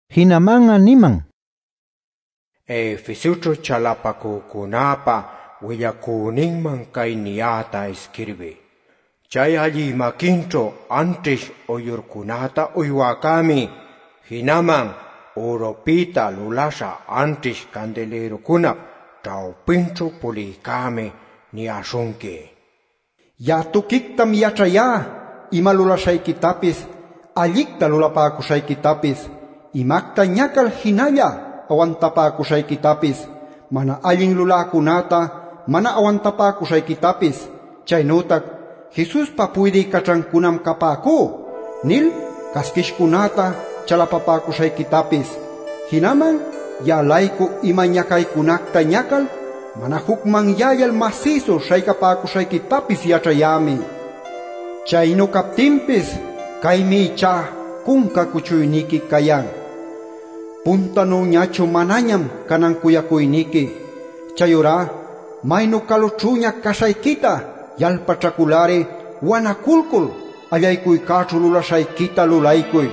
Jinaman'a niman: “Efesoćhu chalapacücunäpa willacüninman cay niyäta isquirbiy: Chay allï maquinćhu anćhish uyllurcunacta uywäcämi, jinaman ürupïta luläśha anćhish candilïrucunap ćhawpinćhu pulïcämi niyäśhunqui: Ya'a tuquictam yaćhayá ima lulaśhayquitapis, allicta lulapäcuśhayquitapis, imacta ñacal jinalla awantapäcuśhayquitapis, mana allin luläcunäta mana awantapäcuśhayquitapis, chaynütac ‘Jesuspa puydï caćhancunam capäcú’ nil casquishcunäta chalapapäcuśhayquitapis. Jinaman ya'a-laycu ima ñacaycunacta ñacal mana jucmanyällal masïsu śhaycapäcuśhayquitapis yaćhayämi. Chaynu captinpis caymi ichá cunca cuchuyniqui cayan: Puntanüñachu manañam canan cuyacuyniqui. Chayurá maynu calućhüña caśhayquita yalpaćhacul-ari wanaculcul allaycuycäćhu lulaśhayquita lulaycuy.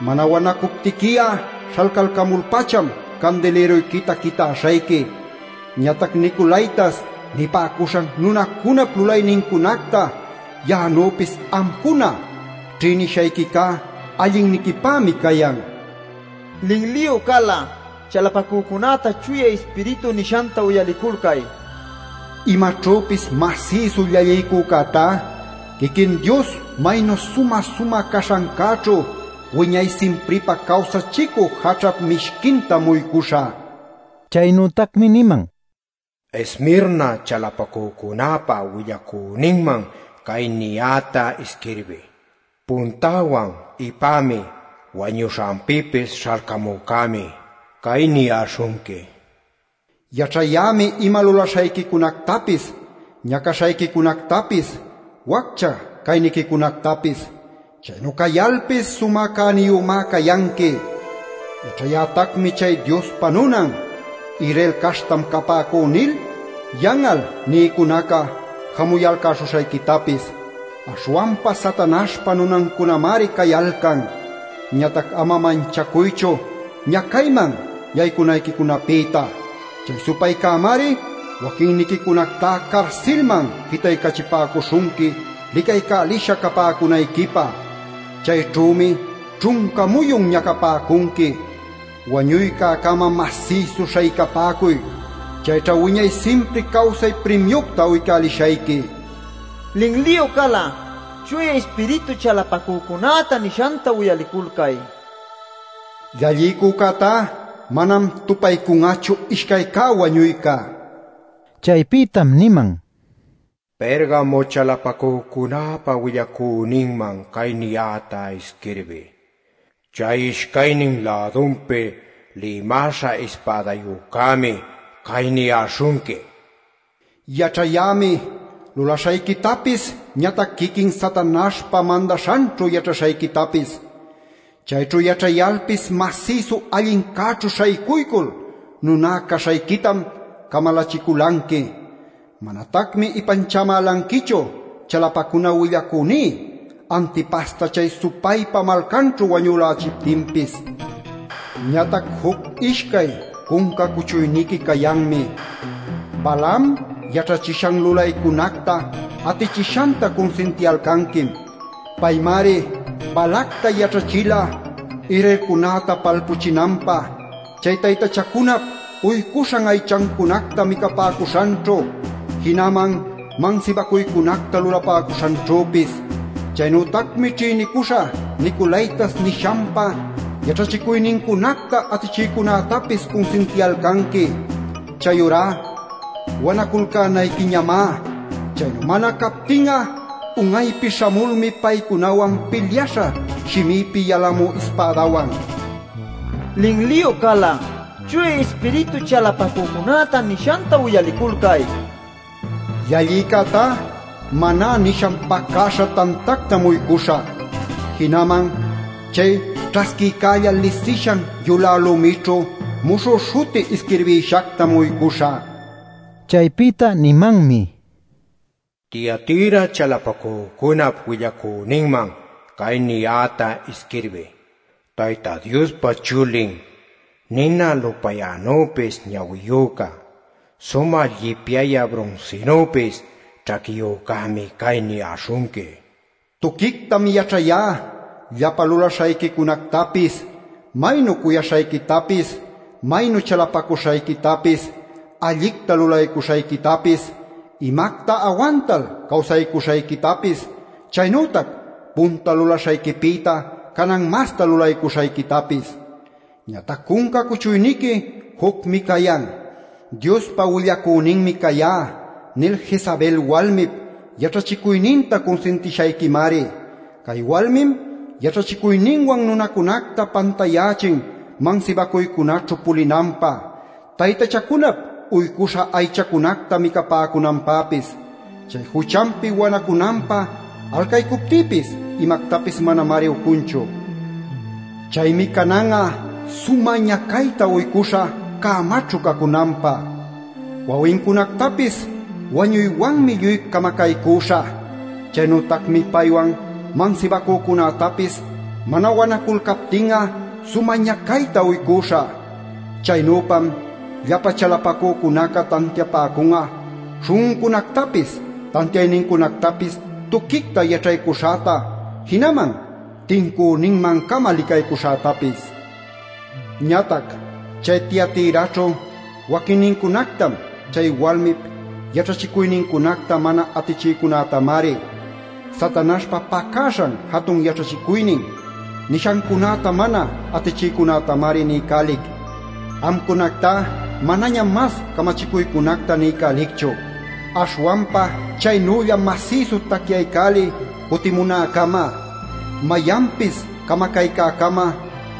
Mana wanacuptiqui'a śhalcamul-pacham candilïruyquita quitäśhayqui. Ñatac ‘Nicolaitas’ nipäcuśhan nunacunap lulaynincunacta ya'anüpis amcuna ćhïnishayquicá allinniquipämi cayan. Linliyu cal'a chalapacücunäta Chuya Ispiritu nishanta uyaliculcay. Imaćhüpis masïsu llalliycücätá quiquin Dios maynu sumä-sumä caśhancäćhu wiñay simpripä cawsachicü jaćhap mishquintam uycuśhä” nil. Chaynütacmi niman: “Esmirna chalapacücunäpa willacüninman cay niyäta isquirbiy: Puntäwan Ipämi, wañuśhanpïpis śhalcamücämi cay niyäśhunqui: Yaćhayämi ima lulaśhayquicunactapis, ñacaśhayquicunactapis, waccha cayniquicunactapis. ¡Chaynu cayalpis sumä cäniyümá cayanqui! Yaćhayätacmi chay ‘Diospa nunam, Israel caśhtam capäcú’ nil yan'al nïcunaca jamuyalcäśhuśhayquitapis. Aśhwanpa Satanaśhpa nunancunamari cayalcan. Ñatac ama manchacuychu ñacayman yaycunayquicunapïta. Chay supaycämari waquinniquicunacta carsilman jitaycachipäcuśhunqui licaycälisha capäcunayquipä. Chayćhümi ćhunca muyun ñacapäcunqui. Wañuycä-cama masïsu śhaycapäcuy; chayćhá wiñay simpri cawsay primiucta uycälishayqui. Linliyu cal'a Chuya Ispiritu chalapacücunäta nishanta uyaliculcay. Llalliycücätá manam tupaycun'achu ishcay cä wañuyca” nil. Chaypïtam niman: “Pergamo chalapacücunäpa willacüninman cay niyäta isquirbiy: Chay ishcaynin lädunpi lïmäśha ispädayücämi cay niyäśhunqui: Yaćhayämi lulaśhayquitapis ñatac quiquin Satanaśhpa mandaśhanćhu yaćhaśhayquitapis. Chayćhu yaćhayalpis masïsu allincäćhu śhaycuycul nuná caśhayquitam camalachiculanqui. Manatacmi ipanchamälanquichu chalapacuna willacüní Antipasta chay supaypa malcanćhu wañülächiptinpis. Ñatac juc-ishcay cunca cuchuyniqui cayanmi: Balaam yaćhachishan lulaycunacta atichishanta cunsintiyalcanquim. Paymari Balacta yaćhachila Israelcunäta palpuchinanpä chay taytachacunap uycuśhan aychacunacta micapäcuśhanćhu, jinaman mansibacuycunacta lulapäcuśhanćhüpis. Chaynütacmi ćhïnicuśhá ‘Nicolaitas’ nishanpa yaćhachicuynincunacta atichïcunätapis cunsintiyalcanqui. Chayurá ¡wanaculcänayquiñamá! Chaynu mana captin'a un'aypi śhamulmi paycunawan pilyaśhä shimïpi yalamü ispädawan. Linliyu cal'a Chuya Ispiritu chalapacücunäta nishanta uyaliculcay. Llallïcätá maná nishan pacäśha tantactam uycuśhä, jinaman chay ćhasquïcälla lisishan yulä lumićhu muśhü śhuti isquirbïshactam uycuśhä” nil. Chaypïta nimanmi: “Tiatira chalapacücunap willacüninman cay niyäta isquirbiy: Tayta Diospa Chulin nina lupayänüpis ñawiyüca, sumä llipyayä brunsinüpis ćhaquiyücämi cay niyäśhunqui: Tuquictam yaćhayá llapa lulaśhayquicunactapis, maynu cuyaśhayquitapis, maynu chalapacuśhayquitapis, allicta lulaycuśhayquitapis, imacta awantal cawsaycuśhayquitapis, chaynütac punta lulaśhayquipïta canan masta lulaycuśhayquitapis. Ñatac cunca cuchuyniqui jucmi cayan: ‘Diospa willacüninmi cayá’ nil Jezabel walmip yaćhachicuyninta cunsintishayquimari. Cay walmim yaćhachicuyninwan nunäcunacta pantayächin mansibacuycunaćhu pulinanpä, taytachacunap uycuśha aychacunacta micapäcunanpäpis. Chay juchanpi wanacunanpä alcaycuptïpis imactapis manamari ucunchu. Chaymi canan'a sumä ñacayta uycüśhä cämaćhu cacunanpä. Wawincunactapis wañuywanmi lluy camacaycüśhä. Chaynütacmi paywan mansibacücunätapis mana wanaculcaptin'a sumä ñacayta uycuśhä. Chaynüpam llapa chalapacücunaca tantiapäcun'a śhun'uncunactapis, tantiaynincunactapis tuquicta yaćhaycuśhäta jinaman tincüninman-cama licaycuśhätapis. Ñatac chay Tiatiraćhu waquinniquicunactam, chay walmip yaćhachicuynincunacta mana atichïcunätamari, ‘Satanaśhpa pacäśhan jatun yaćhachicuynin’ nishancunäta mana atichïcunätamari niycälic: Amcunactá manañam mas camachicuycunacta niycälicchu. Aśhwanpa chaynülla masïsu tacyaycäliy cutimunäcama. Mayanpis camacaycäcama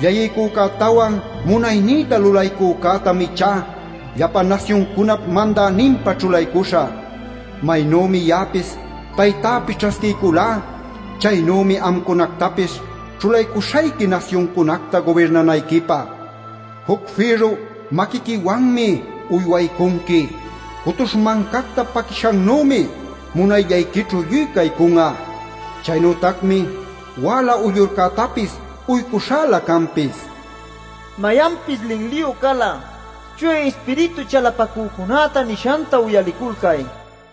llalliycücätawan munaynïta lulaycücätam ichá llapa nasyuncunap mandäninpa ćhulaycuśhä. Maynümi ya'apis Taytäpi ćhasquiyculá, chaynümi amcunactapis ćhulaycuśhayqui nasyuncunacta gubirnanayquipä. Juc fïrru maquiquiwanmi uywaycunqui; cutuśh mancacta paquishannümi munayllayquićhu lluy caycun'a. Chaynütacmi wäla uyllurcätapis uycuśhälä canpis. Mayanpis linliyu cal'a Chuya Ispiritu chalapacücunäta nishanta uyaliculcay” nil.